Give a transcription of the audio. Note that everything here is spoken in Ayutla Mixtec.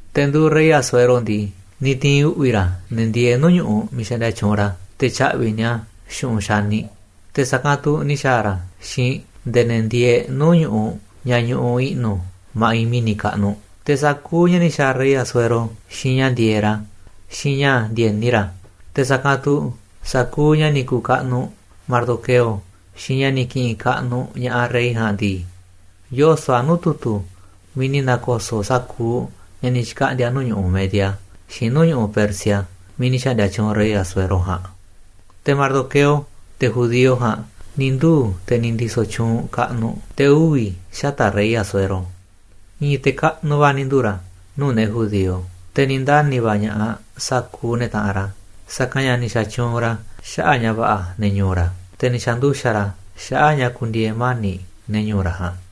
Te̱ nduuꞌ rey Asuero ndii, ni̱ ti̱i̱n uꞌvi̱ ra̱ ne̱ ndieeꞌ nuu̱ꞌ ñu̱ꞌuꞌ miiꞌ xaꞌndia tyuunꞌ ra̱, te̱ tya̱ꞌvi̱ ña̱ꞌaꞌ ni̱a̱ xu̱ꞌunꞌ xaniꞌ, te̱ sa̱kanꞌ tu̱ ni̱ xa̱a̱ ra̱ xiinꞌ nde̱e̱ ne̱ ndieeꞌ nuu̱ꞌ ñu̱ꞌuꞌ ña̱ ñuꞌuꞌ i̱ꞌnu̱ ma̱ꞌiꞌ mi̱ni̱ kaꞌnuꞌ. Te̱ sa̱kuuꞌ ña̱ ni̱ xa̱a̱ rey Asuero xiinꞌ ña̱ ndi̱e̱eꞌ ra̱, xiinꞌ ña̱ ndi̱e̱ni ra̱, te̱ sa̱kanꞌ tu̱ sa̱kuuꞌ ña̱ ni̱ ku̱u̱ kaꞌnuꞌ Mardoqueo, xiinꞌ ña̱ ni̱ ki̱ꞌi̱n kaꞌnuꞌ ña̱ꞌaꞌ rey ja̱a̱nꞌ ndii, yoso̱ꞌ a̱ nuu̱ꞌ tu̱tu̱ miiꞌ ni̱ na̱ko̱so̱ꞌ sa̱kuuꞌ ña̱ ni̱ xkaꞌndi̱a̱ nuu̱ꞌ ñu̱ꞌuꞌ Media xiinꞌ nuu̱ꞌ ñu̱ꞌuꞌ Persia miiꞌ ni̱ xa̱ꞌndi̱a̱ tyuunꞌ rey Asuero ja̱a̱nꞌ. Te̱ Mardoqueo, te̱ judío ja̱a̱nꞌ, ni̱ nduu̱ te̱ ni̱ ndiso̱ tyuunꞌ kaꞌnuꞌ, te̱ uvi̱ xata̱ꞌ rey Asuero. I̱i̱n te̱ kaꞌnuꞌ va̱ ni̱ nduu̱ ra̱ nuu̱ꞌ ne̱ judío, te̱ ni̱ ndani̱ va̱ ña̱ꞌaꞌ sa̱kuuꞌ ne̱ taꞌanꞌ ra̱, sa̱kanꞌ ña̱ ni̱ xa̱tyuunꞌ ra̱ xaꞌa̱ꞌ ña̱ va̱ꞌa̱ ne̱ ñu̱u̱ ra̱, te̱ ni̱ xa̱nduxa̱ꞌ ra̱ xaꞌa̱ꞌ ña̱ ku̱ndi̱e̱e̱ mani̱ꞌ ne̱ ñu̱u̱ ra̱ ja̱a̱nꞌ.